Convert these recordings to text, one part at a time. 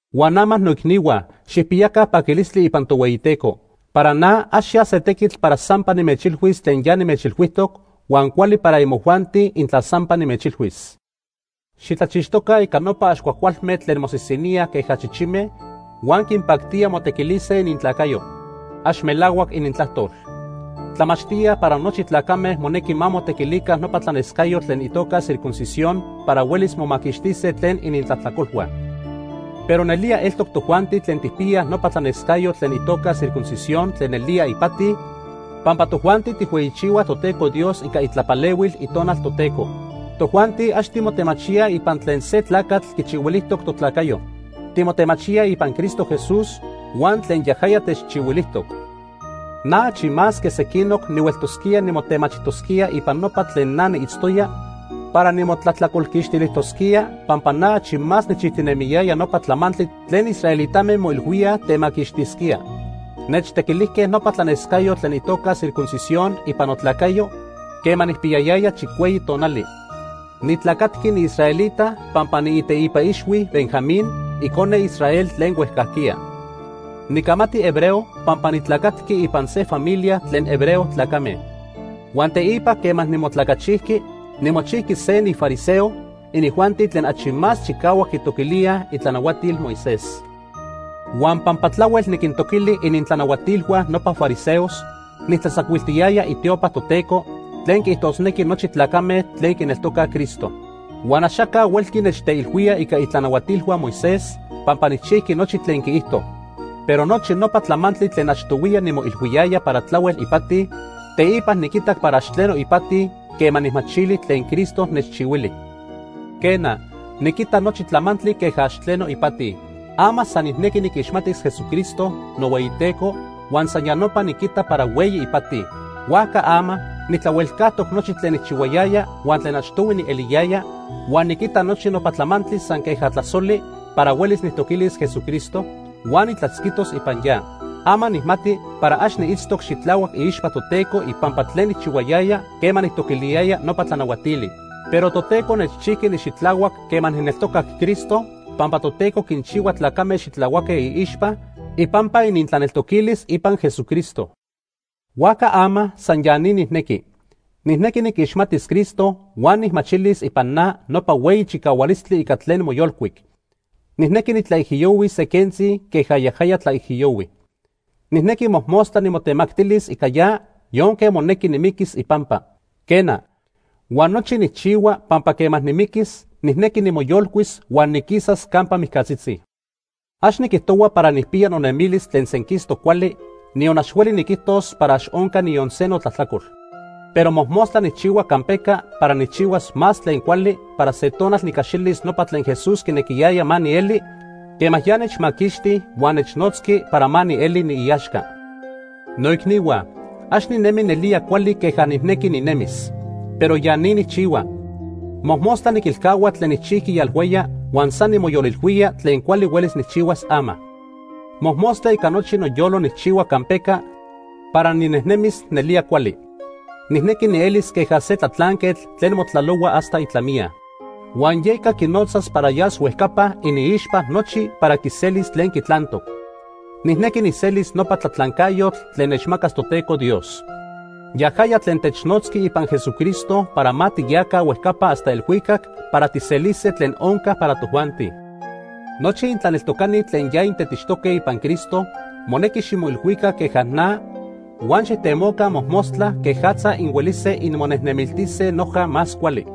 Huan ama, noicnihua, xijpiyaca paquilistli ipan Tohueyiteco. Para na ax ya se tequitl para sampa nimechilhuis tlen ya nimechilhuijtoc, huan cuali para imojuanti intla sampa nimechilhuis. Xitlachixtoca ica nopa ax cuajcualme tlen mosisiníaj queja chichime huan quinpactía motequilise inintlacayo. Ax melahuac inintlajtol. Tlamachtíaj para nochi tlacame monequi ma motequilica nopa tlanescayotl tlen itoca circuncisión para huelis momaquixtise tlen inintlajtlacolhua. Pero nelía eltoc tojuanti tlen tijpiyaj nopa tlanescayotl tlen itoca circuncisión tlen nelía ipati, pampa tojuanti tijhueyichihuaj Toteco Dios ica itlapalehuil Itonal Toteco. Tojuanti ax timotemachíaj ipan tlen se tlacatl quichihuilijtoc totlacayo. Timotemachíaj ipan Cristo Jesús huan tlen yajaya techchihuilijtoc. Na achi más que sequinoc nihueltosquía nimotemachijtosquía ipan nopa tlen na niitztoya para nimotlajtlacolquixtilijtosquía pampa na achi más nijchijtinemiyaya nopa tlamantli tlen israelitame moilhuíaj temaquixtisquía. Nechtequilijque nopa tlanescayotl tlen itoca circuncisión ipan notlacayo quema nijpiyayaya chicueyi tonali. Nitlacatqui niisraelita pampa niiteipa ixhui Benjamín, icone Israel tlen huejcajquiya. Nicamati hebreo pampa nitlacatqui ipan se familia tlen hebreo tlacame. Huan teipa quema nimotlacachijqui, nimochijqui se nifariseo, inijuanti tlen achi más chicahuac quitoquilíaj itlanahuatil Moisés. Huan pampa tlahuel niquintoquili inintlanahuatilhua nopa fariseos, nijtlatzacuiltiyaya itiopa Toteco, tlen quiijtosnequi nochi tlacame tlen quineltocaj Cristo. Huan axaca huelqui nechteilhuía ica itlanahuatilhua Moisés, pampa nijchijqui nochi tlen quiijto. Pero nochi nopa tlamantli tlen achtohuiya nimoilhuiyaya para tlahuel ipati, teipa niquitac para ax tleno ipati quema nijmachili tlen Cristo nechchihuili. Quena, niquita nochi tlamantli queja ax tleno ipati. Ama san nijnequi niquixmatis Jesucristo, nohueyiTeco, huan san ya nopa niquita para hueyi ipati. Huajca ama nijtlahuelcajtoc nochi tlen nijchihuayaya huan tlen achtohui nieliyaya, huan niquita nochi nopa tlamantli san queja tlasoli para huelis nijtoquilis Jesucristo, huan nitlatzquitos ipan ya. Ama nijmati para ax niitztoc xitlahuac iixpa Toteco ipampa tlen nijchihuayaya quema nijtoquiliyaya nopa tlanahuatili. Pero Toteco nechchijqui nixitlahuac quema nijneltocac Cristo, pampa Toteco quinchihua tlacame xitlahuaque iixpa ipampa inintlaneltoquilis ipan Jesucristo. Huajca ama san ya ni nijnequi. Nijnequi niquixmatis Cristo huan nijmachilis ipan na nopa hueyi chicahualistli ica tlen moyolcuic. Nijnequi nitlaijiyohuis se quentzi queja yajaya tlaijiyohui. Nijnequi mojmostla nimotemactilis ica ya yonque monequi nimiquis ipampa. Quena, huan nochi nijchihua pampa quema nimiquis, nijnequi nimoyolcuis huan niquisas campa mijcatzitzi. Ax niquijtohua para nijpiya nonemilis tlen senquistoc cuali, niyon ax hueli niquijtos para ax onca niyon se notlajtlacol. Pero mojmostla nijchihua campeca para nijchihuas más tlen cuali para se tonal nicaxilis nopa tlen Jesús quinequiyaya ma nieli quema ya nechmaquixti huan nechnotzqui para ma nieli niiaxca. Noicnihua, ax ninemi nelía cuali queja nijnequi ninemis. Pero ya ni nijchihua: Mojmostla niquilcahua tlen nijchijqui yalhuaya huan san nimoyolilhuía tlen cuali huelis nijchihuas ama. Mojmostla ica nochi noyolo nijchihua campeca para ninejnemis nelía cuali. Nijnequi nielis queja se tlatlanquetl tlen motlalohua hasta itlamiya. Huan yeca quinotzas para yas huejcapa iniixpa nochi para quiselis tlen quitlantoc. Nijnequi nijselis nopa tlatlancayotl tlen nechmacas Toteco Dios. Yajaya tlen technotzqui ipan Jesucristo para ma tiyaca huejcapa hasta elhuicac para tijselise tlen onca para tojuanti. Nochi intlaneltocani tlen ya intetixtoque ipan Cristo monequi ximoilhuica queja na huan xijtemoca mojmostla quejatza inhuelise inmonejnemiltise noja más cuali.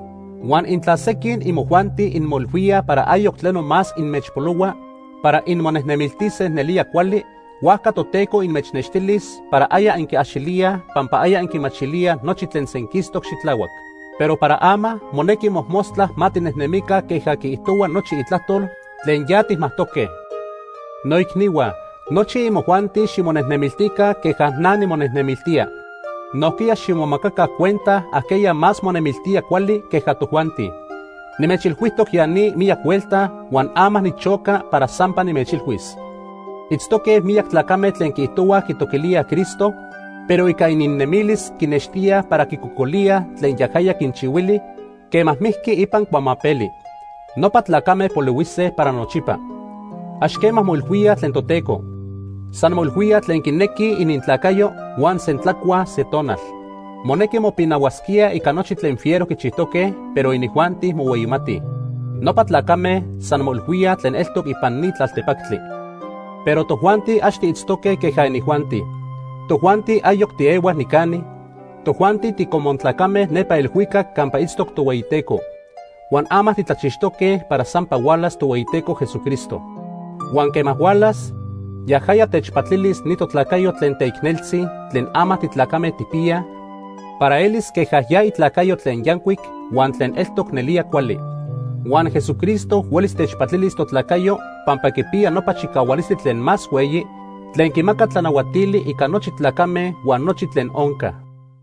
Huan intla sequin imojuanti inmoilhuíaj para ayoc tleno más inmechpolohua para inmonejnemiltise nelía cuali, huajca Toteco inmechnextilis para aya inquiaxilíaj pampa aya inquichihuaj nochi tlen senquistoc xitlahuac. Pero para ama monequi mojmostla ma tinejnemica queja quiijtohua nochi itlajtol tlen ya tijmajtoque. Noicnihua, nochi imojuanti ximonejnemiltica queja na nimonejnemiltía. Nojquiya ximomacaca cuenta ajqueya más monemiltíaj cuali queja tojuanti. Nimechilhuijtoc ya ni miyac huelta huan ama nichoca para sampa nimechilhuis. Itztoque miyac tlacame tlen quiijtohuaj quitoquilíaj Cristo, pero ica ininnemilis quinextíaj para quicocolíaj tlen yajaya quinchihuili quema mijqui ipan cuamapeli. Nopa tlacame polihuise para nochipa. Ax quema moilhuíaj tlen Toteco. San moilhuíaj tlen quinequij inintlacayo huan sentlacuaj se tonal. Monequi mopinahuasquíaj ica nochi tlen fiero quichijtoque, pero inijuanti mohueyimatij. Nopa tlacame san moilhuíaj tlen eltoc ipan ni tlaltepactli. Pero tojuanti ax tiitztoque queja inijuanti. Tojuanti ayoc tiehuaj nicani, tojuanti ticomun tlacame nepa elhuicac campa itztoc Tohueyiteco. Huan ama titlachixtoque para sampa hualas Tohueyiteco Jesucristo. Huan quema hualas, yajaya techpatilis ni totlacayo tlen teicneltzi tlen ama titlacame tijpiyaj para elis queja ya itlacayo tlen yancuic huan tlen eltoc nelía cuali. Huan Jesucristo huelis techpatilis totlacayo pampa quipiya nopa chicahualistli tlen más hueyi tlen quimaca tlanahuatili ica nochi tlacame huan nochi tlen onca.